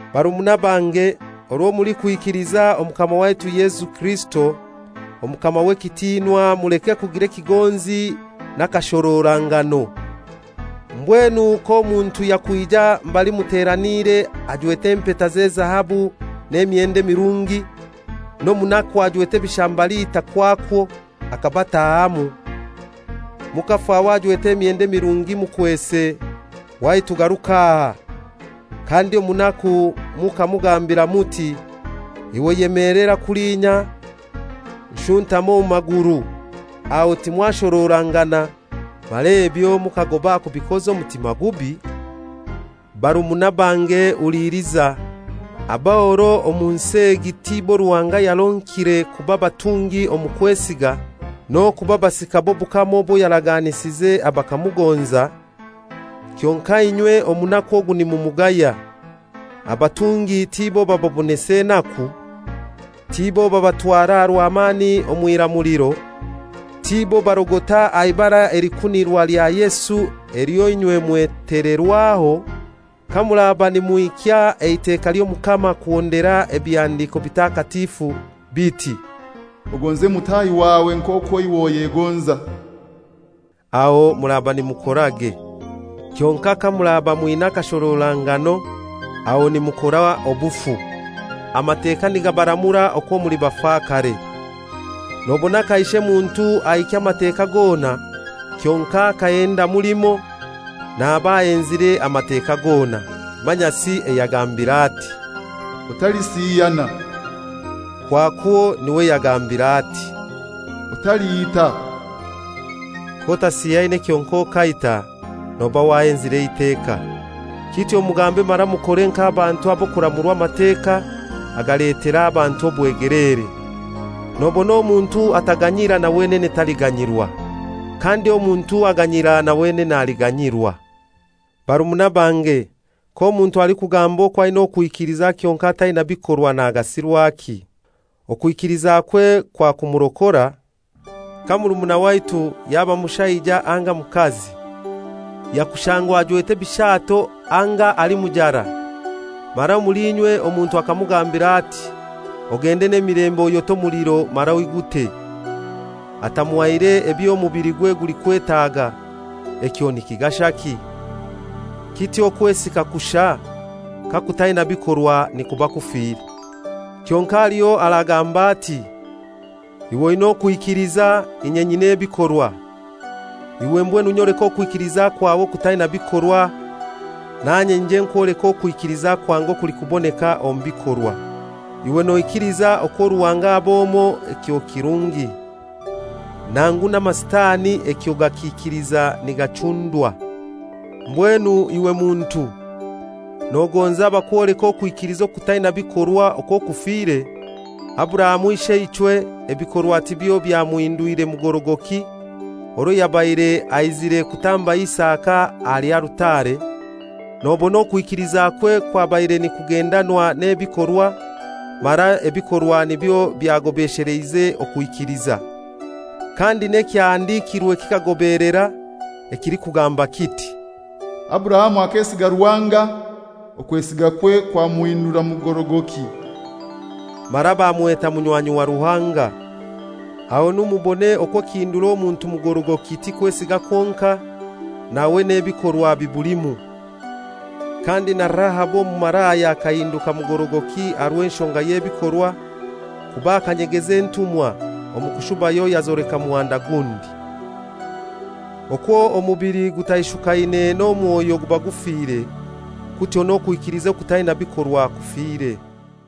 Barumuna bange, orwo mulikwikiliza Omukama waitu Yesu Kirisito, Omukama w'ekitinwa, muleke kugira ekigonzi n'akashororangano. Mbwenu k'omuntu yakwija mbali muteraniire ajwete empeta z'ezahabu n'emyendo emirungi, n'omunaku ajwete ebishambalita kwakwo akabataahamu, mukafaho ajwete emyendo emirungi mukwese, «Waitu garuka aha,» kandi omunaku mukamugambira muti, «Iwe yemelera kulinya! Nshuntaama omu maguru.» Aho timwashororangana, mara ebyo mukagoba aha kubikoza omutima gubi? Barumuna bange huliliza. Aboro omu nsi egi tibo Ruhanga yaronkire kuba batungi omu kwesiga, n'okuba basika b'obukama obwo yaraganisize abakamugonza? Kyonkai inywe omunaku ogwo nimumugaya. Abatungi tibo bababonesa enaku? Tibo babatwara rwamani omw'iramuliro? Tibo barogota aha Ibara elikunirwa lya Yesu elyo inywe mwetelerwaho? Kamuraba nimuhikya eiteka ly'Omukama kuhondera Ebihandiiko Bitakatifu, biti, «Ogonze mutahi wawe nk'okwo iwe oyegonza,» aho muraba nimukorage. Kyonkai kamuraba mwina akashororanagano, aho nimukora obufu, Amateka nigabaramura okwo muli bafakare. Nobona kaishe muntu ahikya Amateka gona kyonkai akahendamu limoi, naba ahenzire Amateka gona. Manyasi ayagambiire ati, «Otalisiyana,» kwakwo niwe yagambiire ati, «Otaliita.» K'otasiyaine kyonkai okaita, noba wahenzire eiteka. Kityo mugambe mara mukore nk'abantu ab'okuramurwa Amateka agaletera abantu obwegeleere. Nobona omuntu ataganyira na wenene taliganyirwa. Kandi omuntu aganyira na wenene aliganyirwa. Barumuna bange, k'omuntu alikugamba okwo aina okwikiliza kyonkai ataina bikorwa nagasirwaki? Okwikilizakwe kwakumurokora? Ka murumuna waitu, yaba mushaija anga mukazi, yakushangwa ajwete ebishaato anga ali mujara, mara omuli inywe omuntu akamugambira ati, «Ogende n'emilembe, oyote omuliro mara oigute,» atamuhaire eby'emubiligwe gulikwetaga, ekyo nikigashaki? Kityo okwesiga kushai, kakutaina bikorwa, nikuba kufire. Kyonkai haliho aragamba ati, «Iwe oina okwikiliza, inye nyina ebikorwa,» iwe mbwenu nyoleka okwikiliza kwawe okutaina bikorwa, nanye nyije nkwoleke okwesiga kwange okulikuboneka omu bikorwa. Iwe noikiliza okwo Ruhanga ab'omoi; ekyo kirungi. Nangu n'amasitani ekyo gakiikiliza nigachundwa. Mbwenu iwe muntu, nogonza bakwoleke okwikiliza okutaina bikorwa okwo kufire? Aburahamu isheichwe, ebikorwa tibyo byamuhindwire mugorogoki, orwo yabaire aizire kutamba Isaka aha alutare? Nobona okwo okwikilizakwe kwabaire nikugendanwa n'ebikorwa, mara ebikorwa nibyo byagobesheleize okwikiliza. Kandi n'ekyahandikirwe kikagobelera, ekilikugamba kiti, «Aburahamu akesiga Ruhanga, okwesigakwe kwamuhindura mugorogoki;» mara bamweta munywanyi wa Ruhanga. Ahonu mubone okwo ekihindura omuntu akaba mugorogoki ti kwesiga kwonkai, nawe n'ebikorwa bibulimu. Kandi na Ahabu omumalaya akahinduka mugorogoki aha rw'enshonga y'ebikorwa; kuba akanyegeza entumwa, omu kushubayo yazoleka muhanda gundi. Okwo omubili ogutaishukaine n'omwoyo guba gufire, kutyo n'okwikiliza okutaina bikorwa kufire.